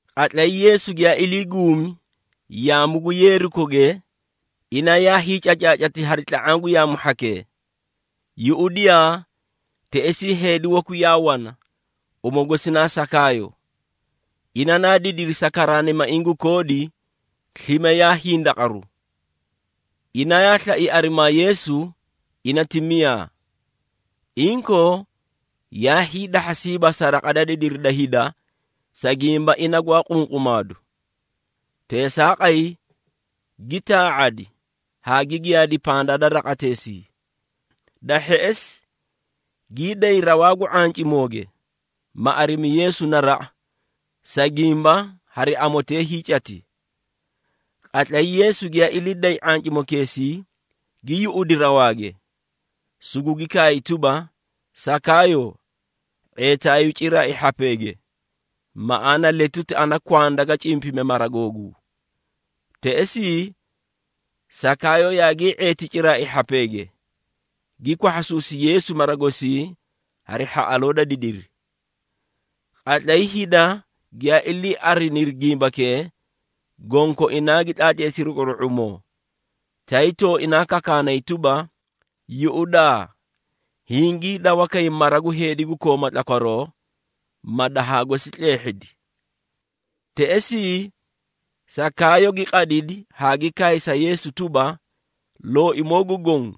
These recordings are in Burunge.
Qatlay Yeesu giyaa ilii guumi yaamu gu Yeerikoge, ina yaa hiicacaacati hari tla⁄aã gu yaamu hhakee. Yuꞌudiyaa, teꞌesii heedi waku yaa wana, uma gosi na Sakaayo. Ina naa didiri sa karaanimaiĩ gu koodi, slime yaa hindaqaru. Ina yaa slai arimaa Yeesu, ina ti miyaa. Inkoo, yaa hiidahhasiiba sa raqa da didiri da hida, sa gimba ina gwaa qunqumaadu. Teesaaqay, gi taa⁄adi haa gi giyaadi pandaa da raqateesii. Da hheꞌesi, gii day rawaa gu ⁄ancimooge, ma arimi Yeesu naraꞌa, sa gimba hari amotee hiicati. Qatlay Yeesu giyaa ilii day ⁄ancimokeesii, gi yuꞌudi rawaage, sugugi kaay tuba, “Sakaayo, ⁄eetaayuu ciraai hhapeege, maꞌaana letuti ana kwanda ga cimpime mara googuu!” Teꞌesii, Sakaayo yaagii ⁄eeti ciraai hhapeege, gi kwahhasuusi Yeesu mara gosii hari hhaꞌaloo da didiri. Qatlay hida giyaa ilii ariniri gimbakee, gonkoinaa gi tlaatleesiri quru⁄umoo, tay tooinaa kakaanay tuba, “Yuꞌudaa! Hingii dawa kay mara gu heedi gu kooma tlakwaroo, ma dahaa gosi tleehhidi.” Teꞌesii, Sakaayo gi qadidi haa gi kaay sa Yeesu tuba, “Looimoo gu Goõ,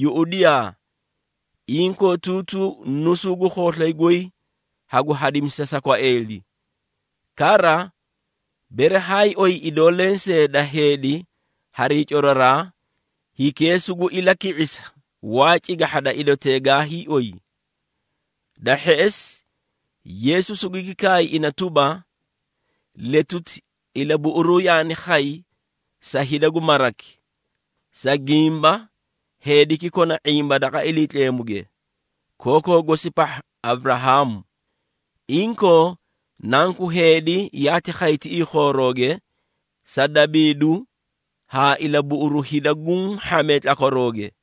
yuꞌudiyaa! Inkootuutuu nusuu gu khooslay goy hagu hadimisa sa kwaeeli. Kara, bere haay oyi idoo lensee da heedi harii coraraa, hikee sugu ilaki⁄isa waa cigahha da idotee gaa hiioy.” Da hheꞌesi, Yeesu sugugi kaay ina tuba, “Letuti, ilabuꞌuruu yaani khay sa hida gu maraki, sa gimba heediki kona ⁄imba daqa Iliitleemuge, kookoo gosi pahha Aburahaamu. Inkoo, Nanku Heedi yaati khay tiꞌii khoorooge, sa dabiidu haa ilabuꞌuru hida guũ hhamee tlakwarooge.”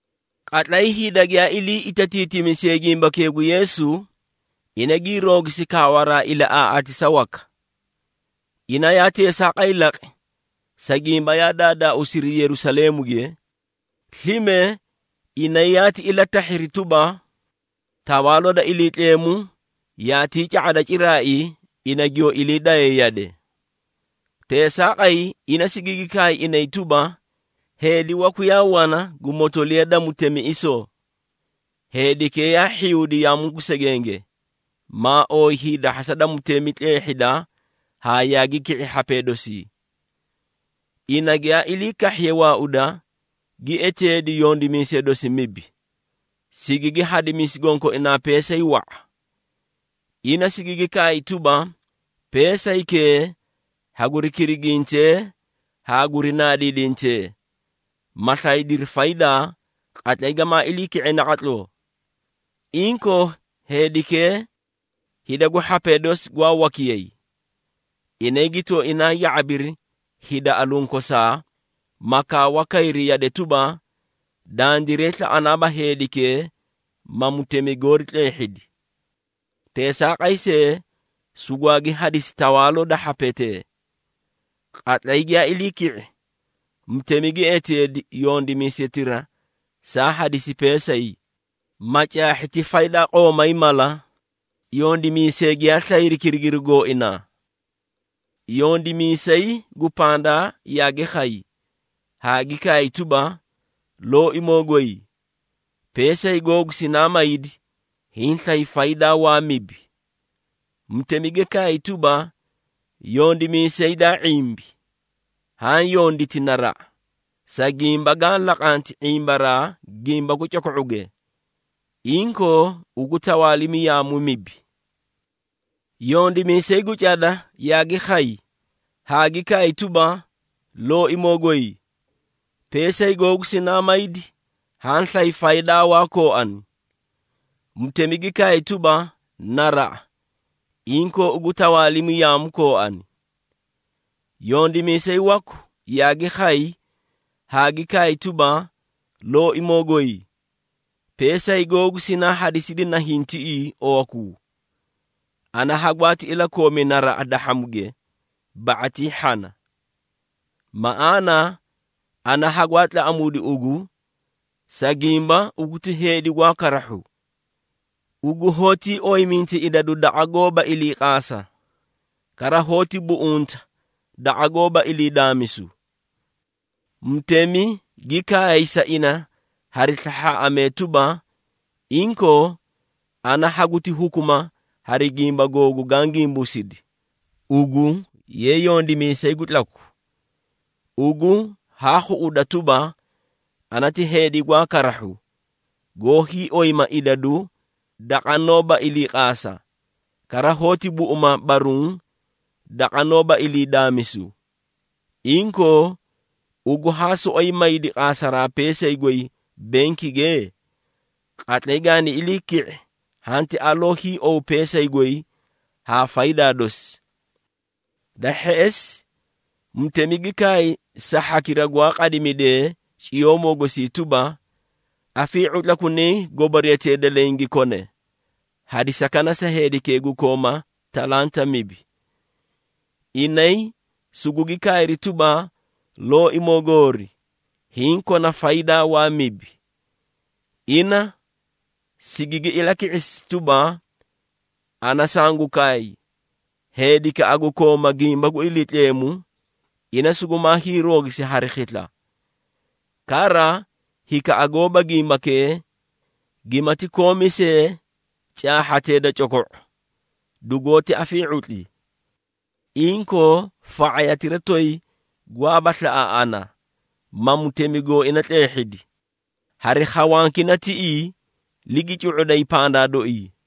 Qatlay hida giyaa ilii itatiitimisiyee gimbakee gu Yeesu, ina gii roogisi kaawaraa ilaꞌaaꞌaatisa waka. Ina yaa teesaaqay laqi, sa gimba yaa daadaauusiri Yerusaleemuge, slime inay yaati ilatahhiri tuba, Tawaaloo da Iliitleemu yaatii ca⁄ada ciraai ina giyoo ilii day yade. Teesaaqay, ina sigigi kaay inay tuba, “Heedi waku yaa wana gu motoliya da mutemiꞌisoo. Heedikee yaa hhiyuudi yaamu gu segenge, maa ooyi hiidahhasa da mutemi tleehhida haa yaagi ki⁄i hhapee dosii. Ina giyaa ilii kahhiye waauda, gi eteedi yondimiisee dosi mibi, sigigi hadimisi gonkoinaa peesay wa⁄a. Ina sigigi kaay tuba, ‘Peesaykee haguri kirigintee haa guri naadiidintee, ma slaydiri faydaa, qatlay gamaa ilii ki⁄e naqatloo.’ Inkoo heedikee, hida gu hhapee dosi gwaa wakiyay. Inay gi tooinaa ya⁄abiri hida alunkosaa, ma kaawa kayri yade tuba, ‘Dandiray slaꞌanaaba heedikee ma mutemi goori tleehhidi.’ Teesaaqay see, sugwaagi hadisi tawaaloo da hhapetee. Qatlay giyaa ilii ki⁄i, mutemi gi eteedi yondimiisetira saa hadisi peesay, ma caahhi ti faydaa qoomay mala, yondimiisee giyaa slayri kirigiruu gooinaa. Yondimiisay gu pandaa yaagi khay haa gi kaay tuba, ‘Looimoo goy, peesay googu sinaa maydi, hiĩ slay faydaa waa mibi.’ Mutemi gi kaay tuba, ‘Yondimiisay daa ⁄imbi, haã yonditi naraꞌa. Sa gimba gaã laqanti ⁄imbaraa gimba gu coko⁄uge, inkoo ugu tawaalimi yaamu mibi.’ Yondimiisay gu cada yaagi khay haa gi kaay tuba, ‘Looimoo goy, peesay googu sinaa maydi, haã slay faydaa waa kooani.’ Mutemi gi kaay tuba, ‘Naraꞌa, inkoo ugu tawaalimi yaamu kooani.’ Yondimiisay waku yaagi khay haa gi kaay tuba, ‘Looimoo goy, peesay googu sinaa hadisidi nahiĩ tiꞌii owakuu. Ana hagwaati iliikoomi naraꞌa dahhamuge, ba⁄atii hhana. Maꞌaana, ana hagwaa tlaꞌamuudi ugu, sa gimba ugu ti heedi gwaa karahhu. Ugu hoótii oyiminta idadu daqa goóba iliiqaasa, kara hoóti buꞌunta daqa goóba ilii daamisu.’ Mutemi gi kaay sa ina hari slahhaaꞌamee tuba, ‘Inkoo, ana haguti hukuma hari gimba googu gaã gimbuusidi, ugu ye yondimiisay gu tlaku! Ugu haa khuꞌuda tuba, ana ti heedi gwaa karahhu, goó hiioyima idadu daqa noóba iliiqaasa, kara hoóti buꞌuma baruũ daqa noóba ilii daamisuu. Inkoo, ugu haa soꞌoyi maaydi qaasaraa peesay goy benkige? Qatlay gaani ilii ki⁄i hanti aloo hiiowu peesay goy haa faydaa dosi.’ Da hheꞌesi, mutemi gi kaay sa hhakira gwaa qadimidee ciyoomoo gosii tuba, ‘Afii⁄utlakunayi goboriyatee da leẽ gi kone, hadisakana sa hikee gu kooma talanta mibi.’ Inay sugugi kaayri tuba, ‘Looimoo goori, hiĩ kona faydaa waa mibi!’ Ina sigigi ilaki⁄isi tuba, ‘Ana sangu kaay, heedikaꞌa gu kooma gimba gu Iliitleemu, ina sugumaa hiiroogisi hari khisla. Kara hikaꞌa goóba gimbakee, gimati koomi see caahhatee da coko⁄o, dugoóti afii⁄utli. Inkoo, fa⁄ayatira toyi gwaaba slaꞌa ana, ma mutemi gooina tleehhidi, hari khawankina tiꞌii, ligi cu⁄uday pandaa dooii.’”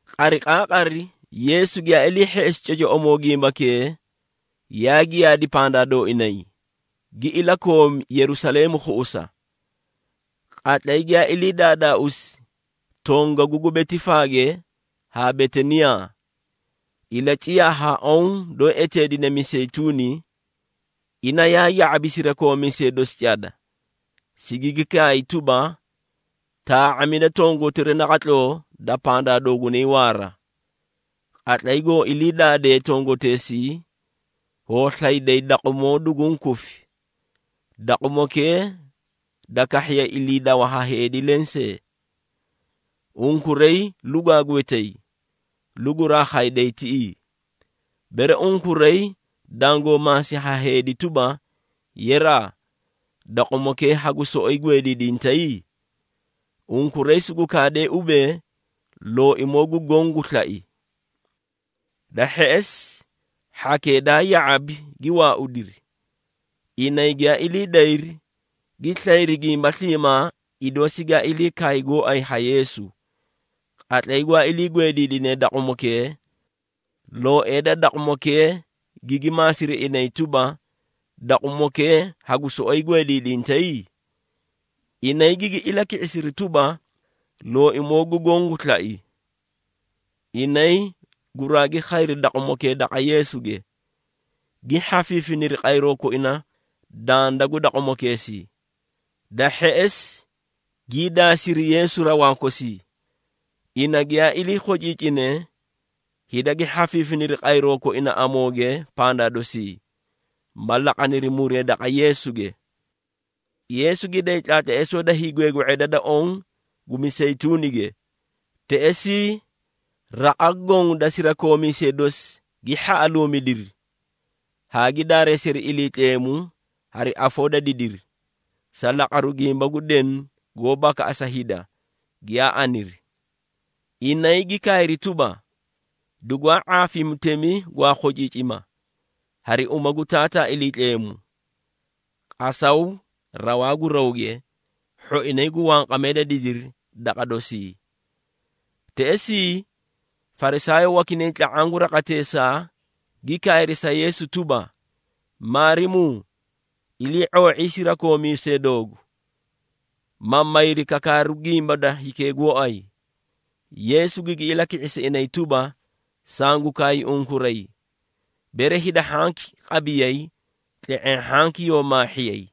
Qariqaaqari, Yeesu giyaa ilii hheꞌesi cocoꞌomoo gimbakee, yaa giyaadi pandaa dooinay, gi ilakoomi Yerusaleemu khuꞌusa. Qatlay giyaa ilii daadaauusi tongagu gu Betifaage haa Betaniyaa, ilaciyaa haa oõ doó eteedine Miseyituuni, ina yaa ya⁄abi sirakoomiisee dosi cada, sigigi kaay tuba, “Taa⁄amida tongotiray naqatloo da pandaa doogunay waara. Qatlay goo ilii daadee tongoteesii, hoo slayday daqumoo duguũ kufi, daqumokee da kahhiye iliidawa ha heedi lensee. Unkuray lugwaa gwetay, luguraa khayday tiꞌii. Bere unkuray dangoo maasi ha heedi tuba, ‘Yeraa, daqumokee hagu soꞌoyi gweediidintay?’ Unkuray sugu kaadee ubee, ‘Looimoo gu Goõ gu slai.’” Da hheꞌesi, hhakee daa ya⁄abi, gi waaudiri. Inay giyaa ilii dayri, gi slayri gimba sliimaa, idoo sigaa ilii kaay gooay ha Yeesu. Qatlay gwaa ilii gweediidinee daqumokee, looee da daqumokee gigi maasiri inay tuba, “Daqumokee hagu soꞌoyi gweediidintay?” Inay gigi ilaki⁄isiri tuba, “Looimoo gu Goõ gu slai.” Inay guraagi khayri daqumokee daqa Yeesuge, gi hhafiifiniri qayroo koina danda gu daqumokeesii. Da hheꞌesi gii daasiri Yeesu rawaa kosii. Ina giyaa ilii khociicine, hida gi hhafiifiniri qayroo koina amooge pandaa dosii, ma laqaniri muree daqa Yeesuge. Yeesu gi day tlaatleesoo da hiigweegwe⁄eda da oõ gu Miseyituunige. Teꞌesii, raqa goõ da sirakoomiisee dosi gi hhaꞌaluumidiri haa gi daareesiri Iliitleemu hari afoo da didiri, sa laqaru gimba gu denu goó bakaꞌasa hida, giyaa aniri. Inay gi kaayri tuba, “Dugwaa ⁄aafi mutemi gwaa khociicima, hari uma gu Taataa Iliitleemu. Qasaw rawaa gu rawge, hhoinay gu wanqamee da didiri daqa dosii.” Teꞌesii, Farisaayoo wakinay tla⁄aã gu raqateesaa, gi kaayri sa Yeesu tuba, “Maarimuu ilii⁄oo⁄ii sirakoomiisee doogu, ma mayri kakaaru gimba da hikee gooay.” Yeesu gigi ilaki⁄isi inay tuba, “Sangu kaay unkuray, bere hida hhanki qabiyay, tle⁄eẽ hhanki yoo maahiiyay.”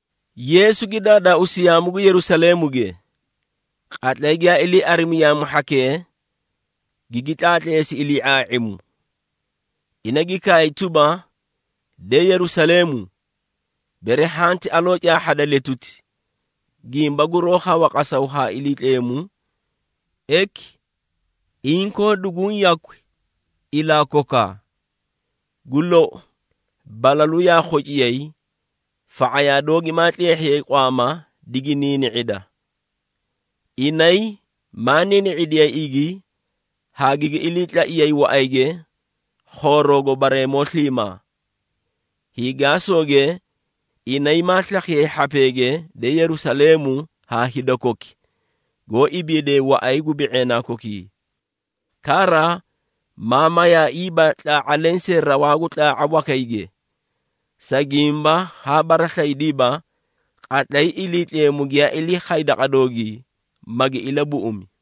Yeesu gi daadaauusi yaamu gu Yerusaleemuge. Qatlay giyaa ilii arimi yaamu hhakee, gigi tlaatleesi ilii⁄aa⁄imu. Ina gi kaay tuba, “De Yerusaleemu, bere hanti aloo caahhada letuti, gimba guroó khawa qasaw haa Iliitleemu, eki, inkoo duguũ yakwi ilaa kokaa. Gu lou, balalu yaa khociyay, fa⁄ayaa doogi maa tleehhiyay qwaama digi niini⁄ida. Inay maa niini⁄idiyay igi haa gigi iliitlaiyay waꞌayge khooroogo bareemoo sliimaa. Hiigaasooge, inay maa slakhiyay hhapeege, de Yerusaleemu, haa hida koki, goó ibiidee waꞌay gu bi⁄eenaa kokii. Kara, maa mayaaiiba tlaa⁄a lensee rawaa gu tlaa⁄a wakayge, sa gimba haa baraslaydiiba, qatlay Iliitleemu giyaa ilii khay daqa doogii, magi ilabuꞌumi.”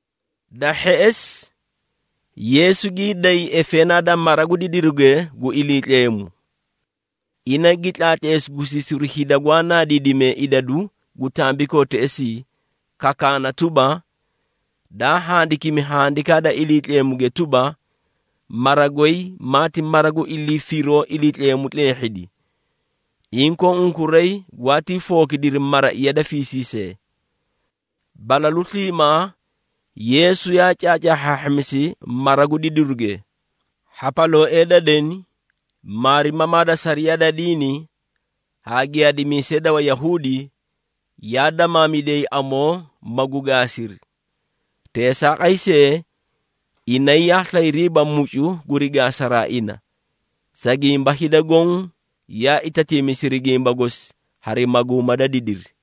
Da hheꞌesi, Yeesu gii day efeenaa da mara gu didiruge gu Iliitleemu. Ina gi tlaatleesi gusiisiru hida gwaa naadiidimee idadu gu tambikoo teꞌesii, kakaana tuba, “Daa handikimi Handikaa da Iliitleemuge tuba, ‘Mara goy maati mara gu ilii firoo Iliitleemu tleehhidi.’ Inkoo unkuray gwaatii fookidiri ‘maraiya da fiisiisee!’” Balalu sliimaa Yeesu yaa caacaahhaahhamisi mara gu didiruge. Hhapalooee da deni, maarimamaa da sariyaa da diini haa giyaadimiisee da Wayahuudi, yaa damaamidiyay amoo, magu gaasiri. Teesaaqay see, inay yaa slayriiba mucu guri gaasaraa ina, sa gimba hida goõ yaa itatiimisiri gimba gosi hari maguuma da didiri.